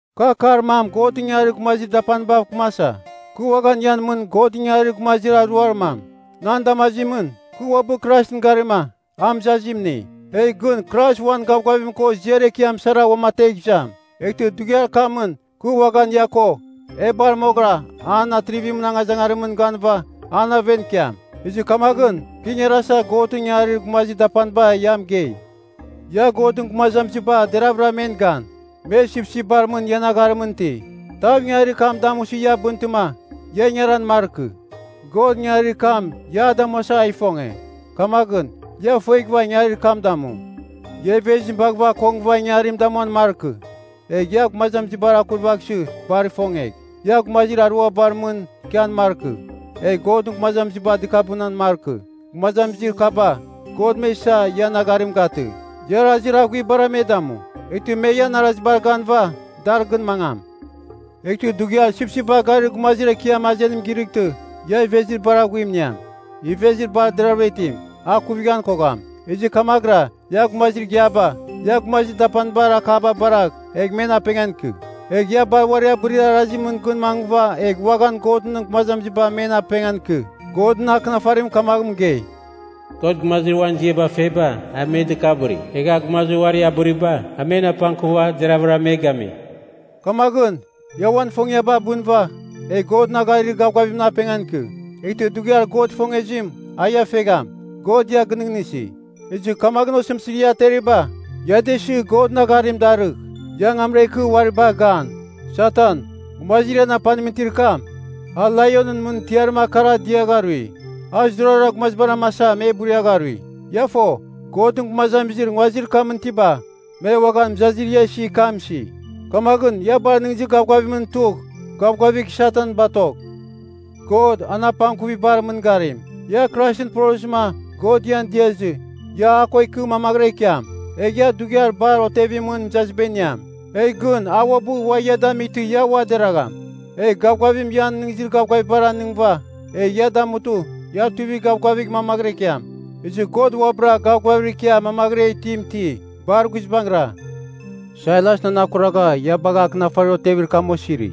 Kɨ akar mam Godɨn ingangarir gumazir dapanibav kɨmasa, kɨ uaghan ian mɨn Godɨn ingangarir gumazir aruar mam. Nan damazimɨn, kɨ uabɨ Kraisɨn garima, a mɨzazim ini. Egh gɨn Krais uan gavgavim ko ziar ekiam sara uamategh izam. Eghtɨ dughiar kamɨn kɨ uaghan ia ko, e bar moghɨra an atrivimɨn angazangarimɨn ganɨva an aven ikiam. Ezɨ kamaghɨn kɨ ingarasa Godɨn ingangarir gumazir dapaniba ia mɨgei. Ia Godɨn gumazamiziba deravɨra men gan. Me sipsipbar mɨn ian agharimɨn iti. Tav ia ingangarir kam damusɨ ia bɨntɨma, ia ingaran markɨ. God ingangarir kam ia a damuasa a ifonge. Kamaghɨn, ia ifueghɨva ingangarir kam damu. Ia ivezim baghɨva akongɨva ingangarim damuan markɨ. Egh ia gumazamizibar akurvaghsɨ bar ifongegh. Ia gumazir aruabar mɨn ikian markɨ, egh Godɨn gumazamiziba dɨkabɨnan markɨ, gumazamizir kaba God me isa ian agharim gatɨ. Ia arazir aghuibar me damu, eghtɨ me ian arazibar ganɨva dar gɨn mangam. Eghtɨ dughiar sipsipbar garir gumazir Ekiam azenim girɨghtɨ, ia ivezir bar aghuim iniam, ivezir bar deravɨra itim, a ikuvighan kogham. Ezɨ kamaghɨra ia gumazir igiaba ia gumazir dapanibar akaba baragh egh men apengan ikɨ. Egh ia bar uari abɨrir arazimɨn gɨn mangɨva egh uaghan Godɨn gumazamiziba men apengan ikɨ. Godɨn Akɨnafarim kamaghɨn mɨgei, “God, gumazir uan ziaba feba, a me dɨkabɨri, egha a gumazir uari abɨriba, a men apangkuva, deraghavɨra me gami.” Kamaghɨn, ia uan ifongiaba abɨnɨva egh Godɨn agharir gavgavimɨn apengan ikɨ. Eghtɨ dughiar God ifongezim a ia fegham. God ia gɨnɨghnɨsi, ezɨ kamaghɨn osɨmtɨzir ia ateriba, ia da isɨ Godɨn agharim darɨgh. Ia angamra ikɨ, uari bagh gan. Satan, gumazir ian apanimɨn itir kam, a laionɨn mɨn tiarim akara diagharui. A zurara gumazibar amasa, me buriagharui. Ia fo, Godɨn gumazamizir nguazir kamɨn itiba, me uaghan mɨzazir ia isir kam isi. Kamaghɨn ia bar nɨghnɨzir gavgavimɨn tugh gavgavigh Satan batogh. God, an apangkuvibar mɨngarim. Ia Kraisɨn porozɨma God ian diazɨ, ia a ko ikɨ mamaghɨra ikiam. Egh ia dughiar bar otevimɨn mɨzaziba iniam, egh gɨn a uabɨ ua ia damightɨ ia ua deragham. Egh gavgavim ian nɨghnɨzir gavgavibar anɨngɨva, egh ia damutɨ ia tuivigh gavgavigh mamaghɨra ikiam. Ezɨ God uabɨra gavgavir ikia mamaghɨra itim iti. Bar guizbangɨra. Sailas nan akuragha, ia bagha akɨnafarir otevir kam osiri.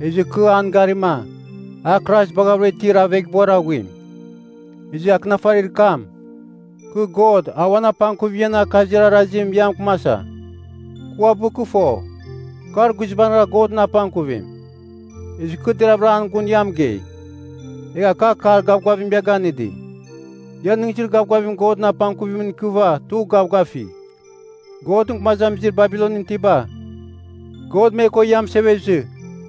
Ezɨ kɨ an garima, a Krais baghavɨra itir aveghbuar aghuim. Ezɨ akɨnafarir kam, kɨ God a uan apangkuvim ian akazir arazim ia mɨkɨmasa. Kɨ uabɨ kɨ fo, kar guizbangɨra Godɨn apangkuvim, ezɨ kɨ deravɨra an gun ia mɨgei. Egha kɨ akar gavgavim ia ganɨdi, ia nɨghnɨzir gavgavim Godɨn apangkuvimɨn ikɨva tugh gavgafigh. Godɨn gumazamizir Babilonɨn itiba, God me ko ia mɨsevezɨ,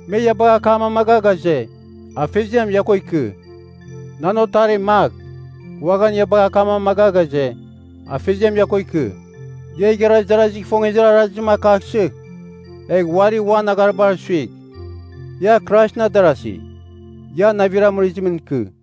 me ia bagha akam amaga ghaze, Afeziam ia ko ikɨ. Nan otarim, Mak, uaghan ia bagha akam amaga ghaze, Afeziam ia ko ikɨ. Ia igharaz darazigh ifongezir arazim akaghsɨ, egh uari uan agharibar suigh. Ia Kraisɨn adarasi, ia navir amɨrɨzimɨn ikɨ.